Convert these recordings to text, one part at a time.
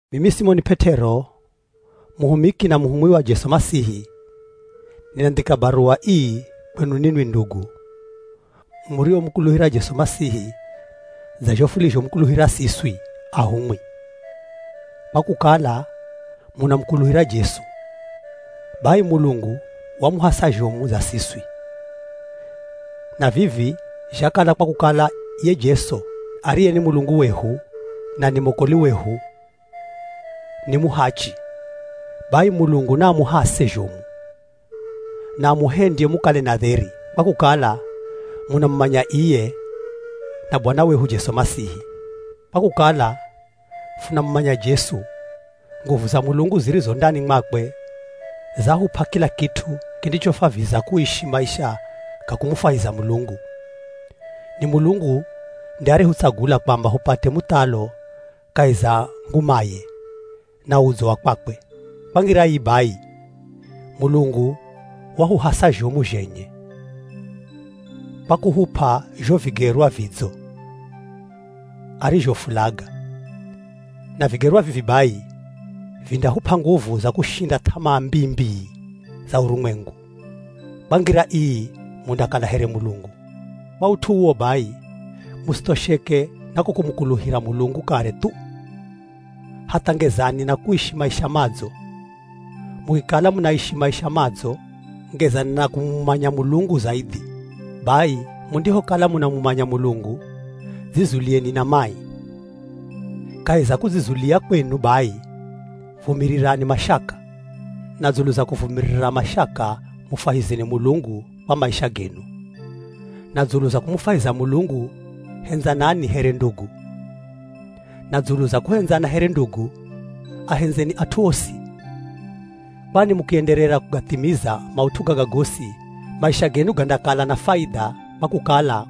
Mimi Simoni P'et'ero muhumiki na muhumwi wa Jesu Masihi, ninandhika baruwa ii kwenu ninwi ndugu muriomukuluhira Jesu Masihi dza zho furizhomukuluhira siswi ahumwi. Kwa kukala munamukuluhira Jesu, bai Mulungu wamuhasa zhomu dza siswi, na vivi zhakala kwa kukala ye Jesu ariye ni Mulungu wehu na ni mwokoli wehu ni muhachi. Bai Mulungu naamuhase zhomu na amuhendye mukale na dheri, kwa kukala munamumanya iye na Bwana wehu Jesu Masihi. Kwa kukala funamumanya Jesu, nguvu za Mulungu zirizo ndani mwakwe zahup'a kila kit'u kindichofwaviza kuishi maisha ga kumufwahiza Mulungu. Ni Mulungu nde arehutsagula kwamba hupate muthalo kahi za ngumaye na udzo wa kwakwe. Kwa ngira ii bai Mulungu wahuhasa zhomu zhenye kwa kuhup'a zho vigerwa vidzo arizhofulaga. Na vigerwa vivi bai vindahup'a nguvu za kushinda th'amaa mbii-mbii za urumwengu; kwa ngira ii mundakala here Mulungu. Kwa ut'u uwo bai, musithosheke na ko kumukuluhira Mulungu kare thu, hatha, ngezani na kuishi maisha madzo. Mukikala munaishi maisha madzo, ngezani na kumumanya Mulungu zaidhi. Bai mundihokala munamumanya Mulungu, dzizulieni na mai. Kahi za kudzizulia kwenu bai, vumirirani mashaka. Na dzulu za kuvumirira mashaka mufwahizeni Mulungu kwa maisha genu. Na dzulu za kumufwahiza Mulungu hendzanani here ndugu. Na dzulu za kuhendzana here ndugu ahenzeni at'u osi. Kwani mukienderera kugathimiza maut'u gaga gosi maisha genu gandakala na faidha kwa kukala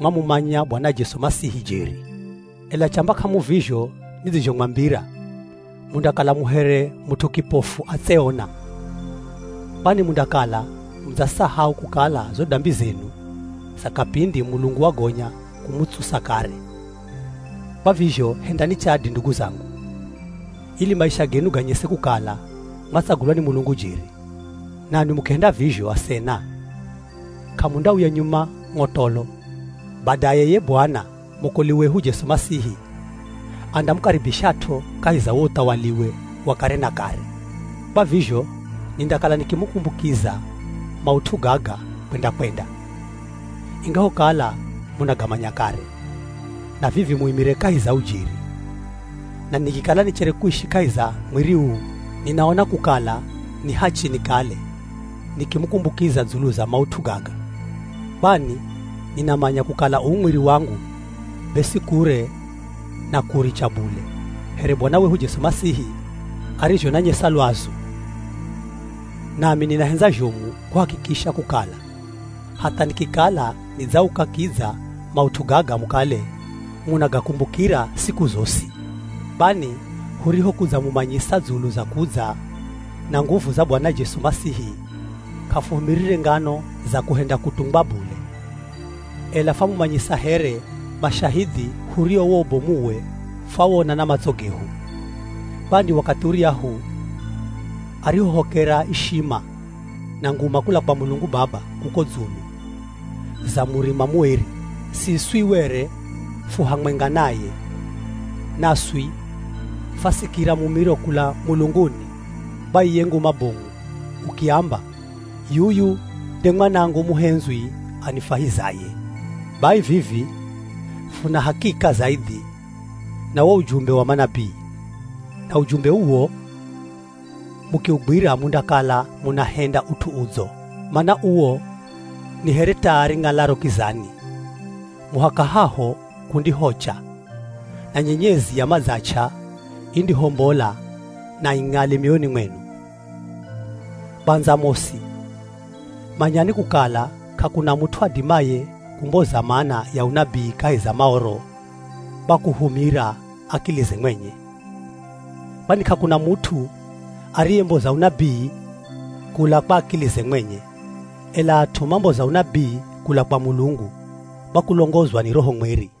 mwamumanya Bwana Jesu Masihi jeri. Ela chamba k'amuvizho nidzizhomwambira mundakala mu here mut'u kipofu atseona, kwani mundakala mudzasahau kukala zo dambi zenu za kapindi Mulungu wagonya kumutsusa kare. Kwa vizho hendani chadi ndugu zangu, ili maisha genu ganyese kukala mwatsagulwa ni Mulungu jeri, nanwi mukihenda vizho asena, k'amundauya nyuma ng'otolo. Badaye ye Bwana, mwokoli wehu Jesu Masihi, andamukaribishat'o kahi za wo uthawaliwe wa kare na kare. Kwa vizho nindakala nikimukumbukiza maut'u gaga kwenda-kwenda, ingahokala munagamanya kare, na vivi muimire kahi za ujeri. Na nikikala nichere kuishi kahi za mwiri uu, ninaona kukala ni hachi nikale nikimukumbukiza dzulu za maut'u gaga. Kwani ninamanya kukala uu mwiri wangu be si kure na kuuricha bule, here Bwana wehu Jesu Masihi arizhonayesa lwazu. Nami ninahendza zhomu kuhakikisha kukala, hatha nikikala nidzauka kidza maut'u gaga mukale munagakumbukira siku zosi. Kwani hurihokudzamumanyisa dzulu za kudza na nguvu za Bwana Jesu Masihi, k'afuhumirire ngano za kuhenda kutungwa bule, ela fwamumanyisa here mashahidhi hurio wo ubomuwe fwawona na matso gehu. Kwani wakathi uryahu arihohokera ishima na nguma kula kwa Mulungu Baba kuko dzulu za murima mueri, siswi were fu hamwenga naye. Naswi fwasikira mumiro kula mulunguni kwa iye Nguma Bomu ukiamba, “Yuyu nde Mwanangu muhendzwi anifwahizaye.” Bai vivi funa hakika zaidhi na wo ujumbe wa manabii. Na ujumbe uwo mukiugwira mundakala munahenda ut'u udzo mana uwo ni here taa ring'alaro kizani, muhaka haho kundihocha na nyenyezi ya madzach'a indihombola na ing'ale mioyoni mwenu. Kwandza mosi, manyani kukala k'akuna mut'u adimaye kumboza mana ya unabii kahi za Maoro kwa kuhumira akilize mwenye. Kwani k'akuna mut'u ariyemboza unabii kula kwa akilize mwenye, ela at'u mamboza unabii kula kwa Mulungu kwa kulongozwa ni Roho Mweri.